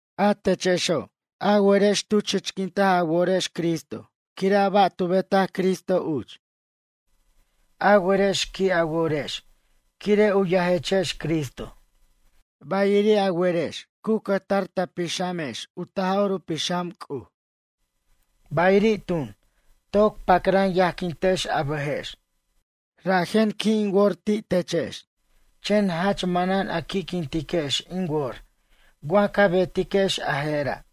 A techexo', a werex tu chichquint a worex Cristo quire' a ba' tu betaj Cristo uch. A werex qui' a worex quire' u yajechex Cristo, bayiri' a werex cu cʌjtar ta pixʌmex u Taj'or u Pixam C'uj, bayiri' tun, toc pacran yajquintex a bʌjex. Rajen qui' in wor ti' techex, chen jach manan a qui'quintiquex in wor wa ca betiquex a je'ra'.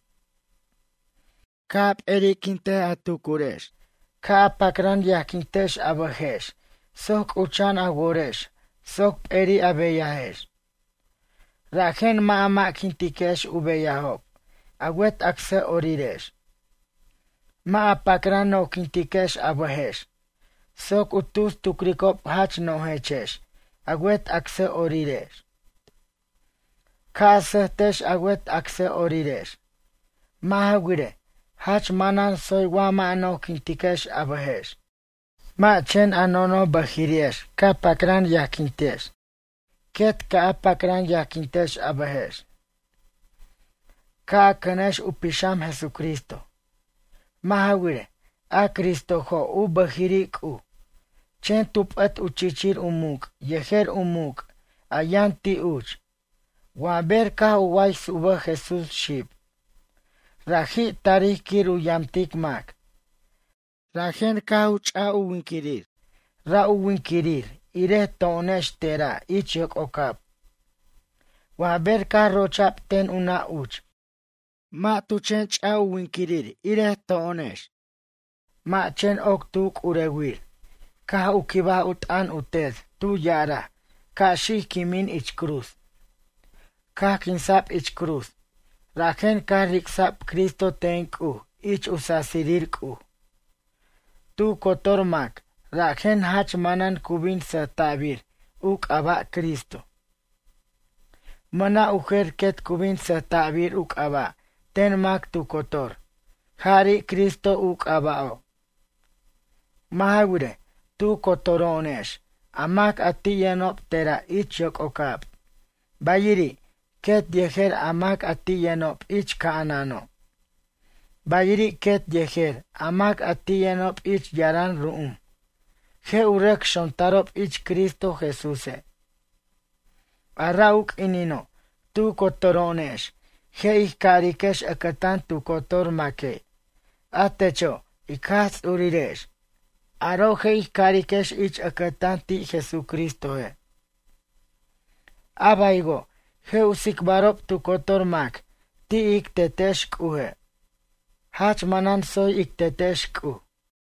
Ca' a p'eri'quint a tucurex, ca' a pacran yajquintex a bʌjex soc c'ucha'an a worex soc peri' a beyajex. Rajen mʌ' a mʌ'quintiquex u beyajob a wet acsʌ'orirex. Mʌ' a pacran nojquintiquex a bʌjex soc u tus tucricob jach nojechex a wet acsʌ'orirex. Ca' a sʌjtex a wet acsʌ'orirex. Mʌ' ja wirej, jach manan tsoy wa mʌ' a nojquintiquex a bʌjex. Mʌ' chen a nonoj bʌjiri'ex ca pacran yajquintex, quet ca' a pacran yajquintex a bʌjex. Ca' a cʌnex u pixam Jesucristo. Mʌ' ja wirej, a Cristojo' u bʌjiri' C'uj, chen tu p'ʌt u chichir u muc' yejer u muc' a yʌn ti' uch. Wa ber caj u ways u bʌj Jesús xib. Raji' tarij quir u yamtic mac, rajen caj u ch'a' u winquirir, ra' u winquirir irej to'onex te'ra' ich yoc'ocab wa ber caj rocha'b ten u nʌ' uch. Mʌ' tu chen ch'a' u winquirir irej to'onex. Mʌ' chen oc tu c'urewir, caj u quibaj u t'ʌn u Tet tu ya'araj ca' xic quimin ich cruz. Caj quinsa'b ich cruz, rajen caj ric'sa'b Cristo ten C'uj ich u sasirir C'uj. Tu cotor mac rajen jach manan cu bin sʌjta'bir u c'aba' Cristo. Mʌna' u jer quet cu bin sʌjta'bir u c'aba' ten mac tu cotor jari' Cristo u c'aba'o'. Mʌ' ja wirej, tu cotoro'onex a mac a ti' yʌnob te'ra' ich yoc'ocab, bayiri', quet yejer a mac a ti' yʌnob ich ca'anano', bayiri' quet yejer a mac a ti' yʌnob ich yaran ru'um, je' u rʌc xontarob ich Cristo Jesúse'. A ra' u q'uinino' tu cotoro'onex je' ij cariquex ʌcʌtan tu cotor maque': “A techo' ic Jaj Ts'urirex.” Aro' je' ij cariquex ich ʌcʌtan ti' Jesucristoje'. A baywo' je' u tsicbarob tu cotor mac ti' ic Tetex C'uje': “Jach manan tsoy ic Tetex C'uj.”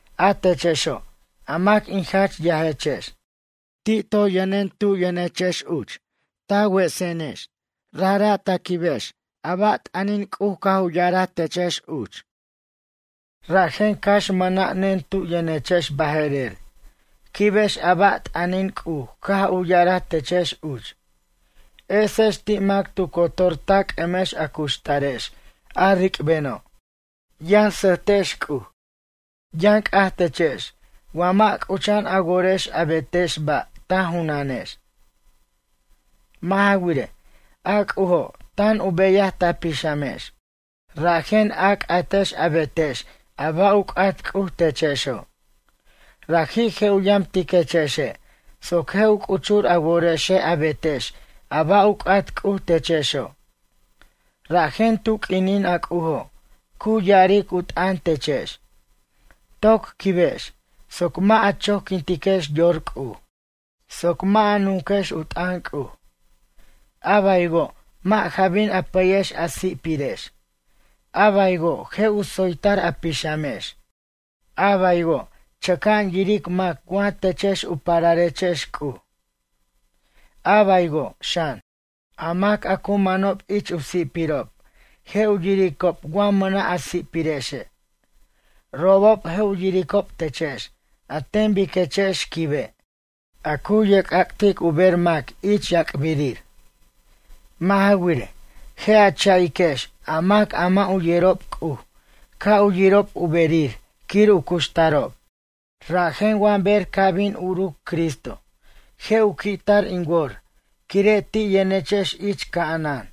A techexo', a mac in jach yajechex. Ti' toy yʌnen tu yʌnechex uch ta wesenex rajra' ta quibex a ba' t'ʌnin C'uj caj u ya'araj techex uch. Rajen cax mʌna'nen tu yʌnechex baje'rer, quibex a ba' t'ʌnin C'uj caj u ya'araj techex uch. Esex ti' mac tu cotor ta c'ʌmex a cuxtarex a ric'beno'. Yʌn sʌjtex C'uj. Yʌn c'aj techex wa mʌ' c'ucha'an a worex a betex ba' ta junanex. Mʌ' ja wirej, a C'ujo' tan u beyaj ta pixamex, rajen a c'atex a betex a ba' u c'at C'uj techexo'. Raji' je' u yamtiquechexe' soc je' u c'uchur a worexe' a betex a ba' u c'at C'uj techexo'. Rajen tu q'uinin a C'ujo', cu ya'aric u t'ʌn techex, toc quibex, soc mʌ' a choquintiquex yor C'uj, soc mʌ' a nunquex u t'ʌn C'uj. A baywo' mʌ' ja bin a pʌyex a si'pirex, a baywo' je' u tsoytar a pixamex, a baywo' chʌca'an yiric mac wa techex u pararechex C'uj, a baywo' xan, a mac a cu manob ich u si'pirob je' u yiricob wa mʌna' a si'pirexe'. Robob je' u yiricob techex an ten biquechex quibe', a cu yerc'ac'tic u ber mac ich yac'birir. Mʌ' ja wirej, je' a cha'iquex a mac a mʌ' u yerob C'uj ca' u yirob u berir quir u cuxtarob. Rajen wa ber ca' bin uruc Cristo, je' u qui'tar in wor quire' ti' yʌnechex ich ca'anan.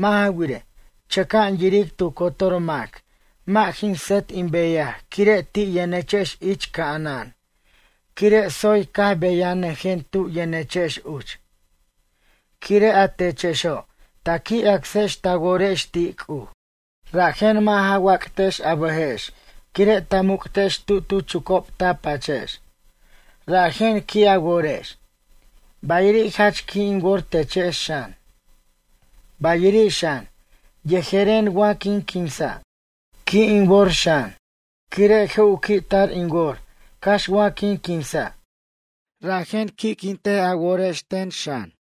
Mʌ' ja wirej, chʌca'an yiric tu cotor mac mʌ' jin sʌt in beyaj quire' ti' yʌnechex ich ca'anan quire' tsoy caj beyanʌjen tu yʌnechex uch. Quire' a techexo', ta qui' acsex ta worex ti' C'uj, rajen mʌ' ja wac'tex a bʌjex quire' ta muc'tex tu tu chucob ta pachex, rajen qui' a worex. Bayiri' jach qui' in wor techex xan. Bayiri' xan, yejeren wa quin quinsa', qui' in wor xan. Quire' je' u qui'tar in wor cax wa quin quinsa', rajen qui'quint a worex ten xan.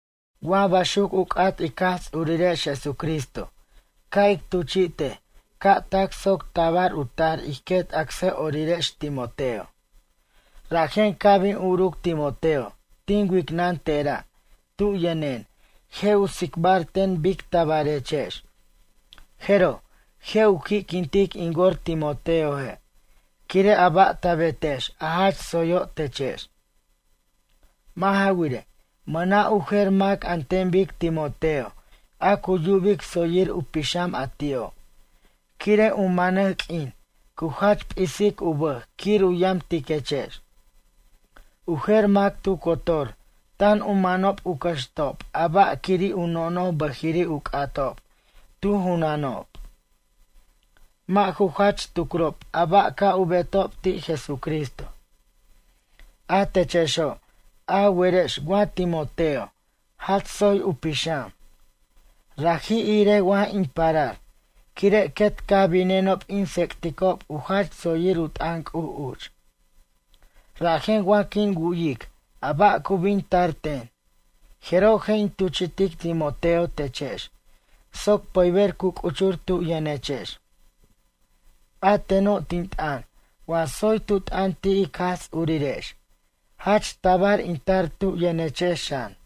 Wa baxuc u c'at ic Jaj Ts'urirex Jesucristo ca' in tuchi'tej ca' tac soc tabar u tar ij quet acsʌ'orirex Timoteo. Rajen ca' bin uruc Timoteo tin wicnʌn te'ra' tu yʌnen je' u tsicbar ten bictabarechex. Jeroj, je' u qui'quintic in wor Timoteoje' quire' a ba' ta betex a jach tsoyo' techex. Mʌ' ja wirej, mʌna' u jer mac an ten bic Timoteo a cu yubic tsoyir u pixam a ti'o', quire' u manej q'uin cu jach p'isic u bʌj quir u yamtiquechex. U jer mac tu cotor tan u manob u cʌxtob a ba' quiri' u nonoj bʌjiri' u c'atob tu junanob. Mʌ' ju jach tucrob a ba' ca' u betob ti' Jesucristo. A techexo', a werex wa Timoteo, jach tsoy u pixam. Raji' irej wa in parar, quire' quet caj binenob in tsec'ticob u jach tsoyir u t'ʌn C'uj uch. Rajen wa quin wu'yic a ba' cu bin tar ten. Jeroj je' in tuchi'tic Timoteo techex soc pʌyber cu c'uchur tu yʌnechex. A teno', tin t'ʌn wa tsoy tu t'ʌn ti' ic Jaj Ts'urirex, jach tabar in tar tu yʌnechex xan.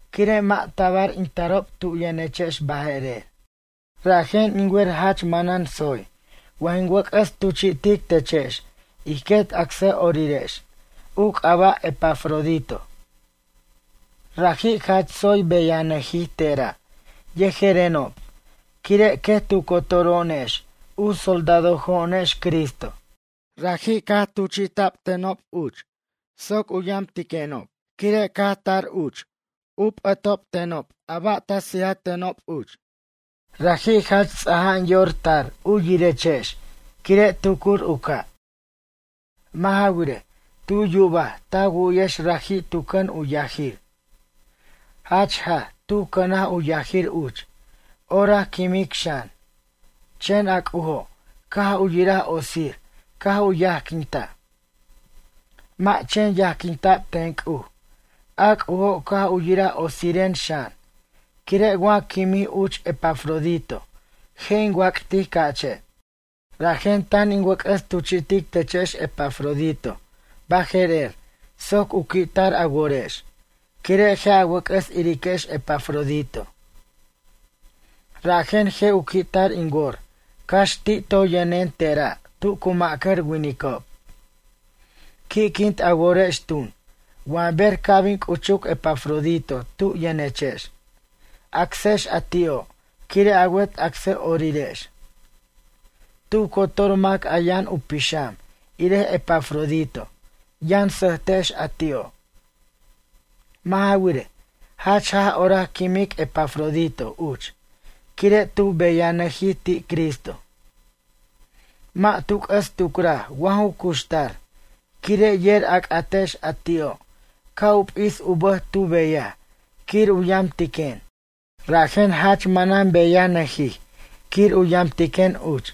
Quire' mʌ' tabar in tarob tu yʌnechex baje'rer, rajen in wer jach manan tsoy wa jin wʌc'ʌs tuchi'tic techex ij quet acsʌ'orirex, u c'aba' Epafrodito. Raji' jach tsoy beyanʌjij te'ra' yejerenob quire' quet tu cotoro'onex u soldadojo'onex Cristo. Raji' caj tuchi'tatenob uch soc u yamtiquenob quire' caj tar uch caj u p'ʌtenob a ba' ta sijatenob uch. Raji' jach ts'ana'an yor tar u yirechex quire' tucur u ca'. Mʌ' ja wirej, tu yubaj ta wu'yex raji' tu cʌn u yajir. Jach jaj tu cʌnaj u yajir uch, orac quimic xan. Chen a C'ujo' caj u yira otsir caj u yajquintaj. Mʌ' chen yajquinta'b ten C'uj, a C'ujo' caj u yiraj otsiren xan, quire' wa quimij uch Epafrodito je' in wac'tic ca'che'. Rajen tan in wʌc'ʌs tuchi'tic techex Epafrodito baje'rer soc u qui'tar a worex, quire' je' a wʌc'ʌs iriquex Epafrodito. Rajen je' u qui'tar in wor cax ti' toy yʌnen te'ra' tu cu ma'cʌr winicob. Qui'quint a worex tun, wa ber ca' bin c'uchuc Epafrodito tu yʌnechex. Acsex a ti'o' quire' a wet acsʌ'orirex. Tu cotor mac a yʌn u pixam irej Epafrodito yʌn sʌjtex a ti'o'. Mʌ' ja wirej, jach jaj orac quimic Epafrodito uch quire' tu beyanʌjij ti' Cristo. Mʌ' tu c'ʌs tucraj wa ju cuxtar quire' yer a c'atex a ti'o' ca' u p'is u bʌj tu beyaj quir u yamtiquen. Rajen jach manan beyanʌjij quir u yamtiquen uch.